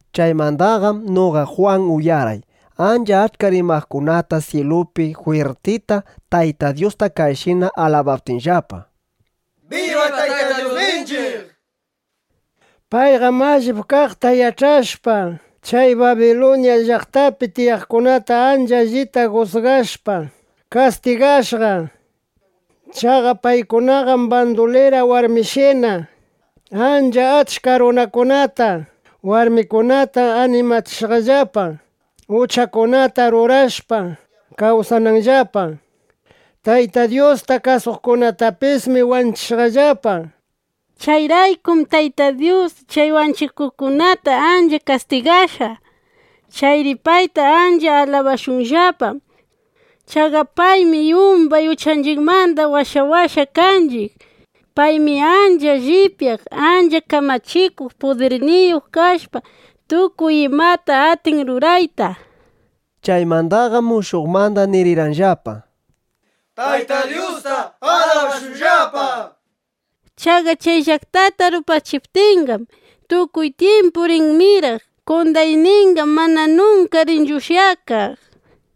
Chaymandaqam noqa Jwan uyarqay ancha achka rimaqkunata syilupi jwirtita Tayta Dyusta kayshina alabaptinllapa: ¡Biba Tayta Dyusninchiq! Payqam allip kaqta yach'ashpa, chay Babiluña llaqtapi tiyaqkunata ancha allita jusgashpa, kastigashqa. Chaqa paykunaqam bandulira warmishina ancha achka runakunata, warmikunata animachishqallapa, uchakunata rurashpa, kawsananllapa. Tayta Dyusta kasuqkunatapismi wanchishqallapa. Chayraykum Tayta Dyus chay wanchikuqkunataqa ancha kastigashqa. ¡Chayri payta ancha alabashunllapa! Chaqa paymi yumbay uchanchiqmanda washawashqa kanchiq. ¡Paymi ancha llipyaq, ancha kamachikuq pudirniyuq kashpa, tukuy imata atin rurayta! nishpa. Chaymandaqam mushuqmanda nirirqanllapa: —¡Tayta Dyusta alabashunllapa! Chaqa chay llaqtata rupachiptinqam, tukuy tyimpu rin miraq. Qondayninqam mana nunka rinchu ushyakaq, nishpa.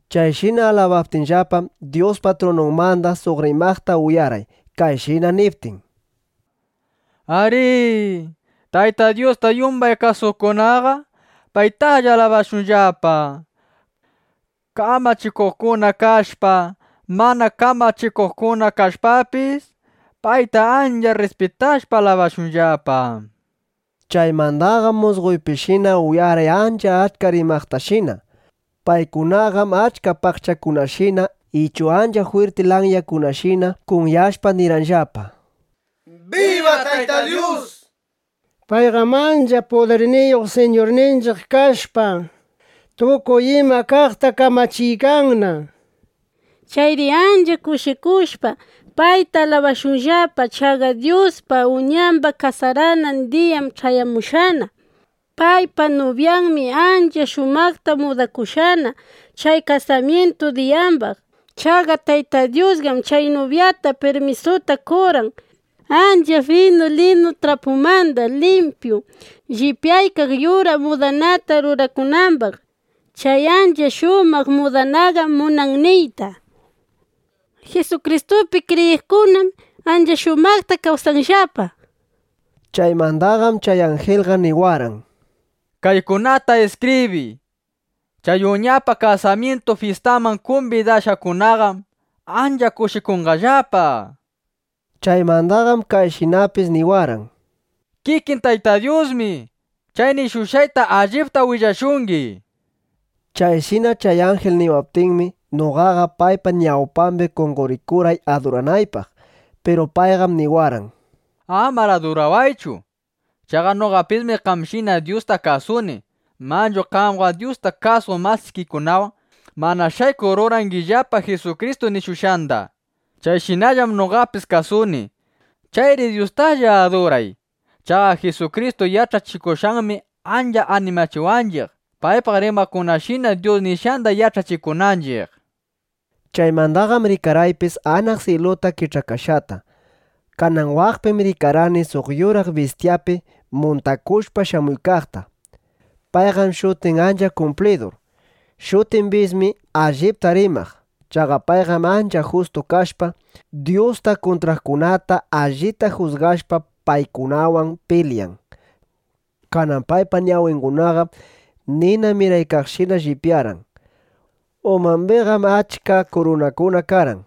Chayshina alabaptinllapam, Dyuspa trununmanda suq rimaqta uyarqay, kayshina niptin: ¡Ariri! ¡Tayta Dyusta yumbay kasuqkunaqa paytalla alabashunllapa! Kamachikuqkuna kashpa, mana kamachikuqkuna kashpapis, payta ancha rrispitashpa, alabashunllapa, nishpa. Chaymandaqam musqoypishina uyarqay ancha achka rimaqtashina. Paykunaqam achka paqchakunashina ichu ancha jwirti lanyakunashina kunyashpa nirqanllapa: ¡Biba Tayta Dyus! Payqam ancha pudirniyuq Siñurninchiq kashpa, tukuy ima kaqta kamachiykanna. Chayri ancha kushikushpa, payta alabashunllapa. Chaqa Dyuspa Uñamba kasaranan diyam ch'ayamushqana. Paypa nubyanmi ancha shumaqta mudakushqana chay kasamyintu diyambaq. Chaqa Tayta Dyusqam chay nubyata pirmisuta qorqan, ancha finu linu trapumanda limpyu llipyaykaq yuraq mudanata rurakunambaq. Chay ancha shumaq mudananqam munan niyta: Jisukristupi kriyiqkunam ancha shumaqta kawsashqallapa, nishpa. Chaymandaqam chay anjilqa niwarqan: —Kaykunata iskibriy: “Chay Uñapa kasamyintu fyistanman kumbidashqakunaqam ancha kushikunqallapa”, nishpa. Chaymandaqam kayshinapis niwarqan: —Kikin Tayta Dyusmi chay nishushqayta allipta willashungi. Chayshina chay anjil niwaptinmi, noqaqa paypa ñawpambi qonqorikurqay aduranaypaq. Piru payqam niwarqan: —Amar adurawaychu. Chaqa noqapismi qamshina Dyusta kasuni. Manchu qamqa Dyusta kasuq masikikunawan mana shaykuq rurangillapa Jisukristu nishushqanda. Chayshinallam noqapis kasuni. Chayri Dyustalla aduray, nishpa. Chaqa Jisukristu yach'achikushqanmi ancha animachiwanchiq, paypaq rimaqkunashina Dyus nishqanda yach'achikunanchiq. Chaymandaqam rikarqaypis anaq syiluta kich'akashqata. Kanan waqpim rikarqani suq yuraq bistyapi muntakushpa shamuykaqta. Payqam shutiq Ancha Kumplidur. Shutiqpismi Allipta Rimaq. Chaqa payqam ancha justu kashpa, Dyusta kuntraqkunata allita jusgashpa, paykunawan pilyan. Kanan paypa ñawingunaqam nina miraykaqshina llipyarqan. Umambiqam achka kurunakuna karqan.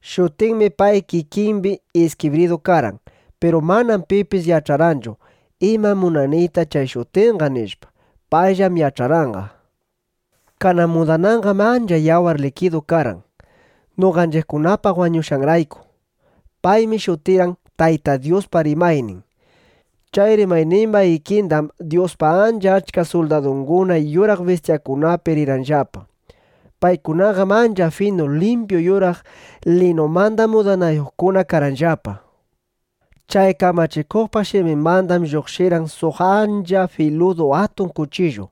Shutinmi pay kikimbi iskibridu karqan. Piru manam pipis yach'arqanchu: Imam munan niyta chay shutinqa, nishpa. Payllam yach'arqanqa. Kanan mudananqam ancha yawar likidu karqan, (noqanchiqkunapaq wañushqanrayku). Paymi shutirqan: Tayta Dyuspa Rimaynin. Chay Rimaynimba ikindam Dyuspa ancha achka suldadunguna yuraq bistyakunapi rirqanllapa. Paykunaqam ancha finu limpyu yuraq linumanda mudanayuqkuna karqanllapa. Chay kamachikuqpa shiminmandam lluqshirqan suq ancha filudu atun kuchillu,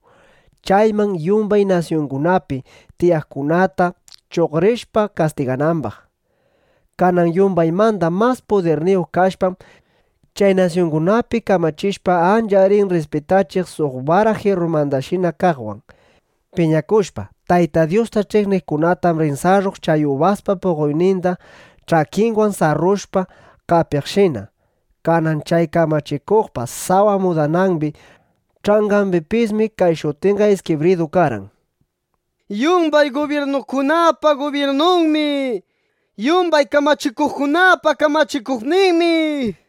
chaywan yumbay nasyungunapi tiyaqkunata chuqrishpa kastiganambaq. Kanan yumbaymanda mas pudirniyuq kashpam, chay nasyungunapi kamachishpa, ancha rin rrispitachiq suq bara jirrumandashina kaqwan. Piñakushpa, Tayta Dyusta ch'iqniqkunatam rin sarruq chay ubaspa puqoyninda ch'akinwan sarrushpa qapiqshina. Kanan chay kamachikuqpa sawa mudanambi ch'angambipismi kay shutinqa iskibridu karqan: “Yumbay gubyirnukunapa gubyirnunmi. Yumbay kamachikuqkunapa kamachikuqninmi”, nishpa.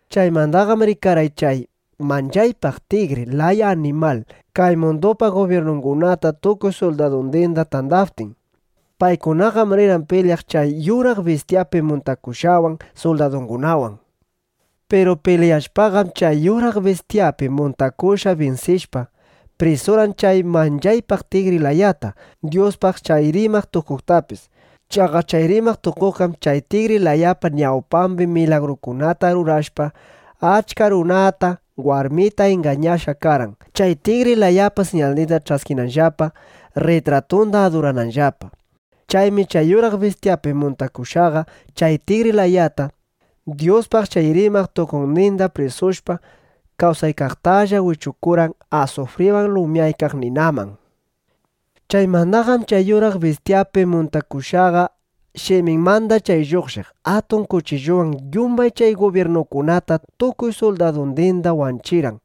Chaymandaqam rikarqay chay manchaypaq tigri laya animal kay mundupa gubyirnungunata tukuy suldadundinda tandaptin. Paykunaqam rirqan pilyaq chay yuraq bistyapi muntakushqawan, suldadungunawan. Piru pilyashpaqam, chay yuraq bistyapi muntakushqa binsishpa, prisurqan chay manchaypaq tigri layata, Dyuspaq chay rimaq tukuqtapis. Chaqa chay rimaq tukuqqam chay tigri layapa ñawpambi milagrukunata rurashpa, achka runata, warmita ingañashqa karqan, chay tigri layapa siñalninda ch'askinanllapa, rritratunda adurananllapa. Chaymi chay yuraq bistyapi muntakushqaqa chay tigri layata, Dyuspaq chay rimaq tukuqnindinda prisushpa, kawsaykaqtalla wichukurqan asufriwan lumyaykaq ninaman. Chaymandaqam chay yuraq bistyapi muntakushqaqa shiminmanda chay lluqshiq atun kuchillunwan yumbay chay gubyirnukunata tukuy suldadundinda wanchirqan.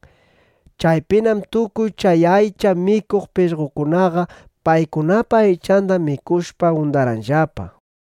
Chaypinam tukuy chay aycha mikuq pishqokunaqa paykunapa aychanda mikushpa undarqanllapa.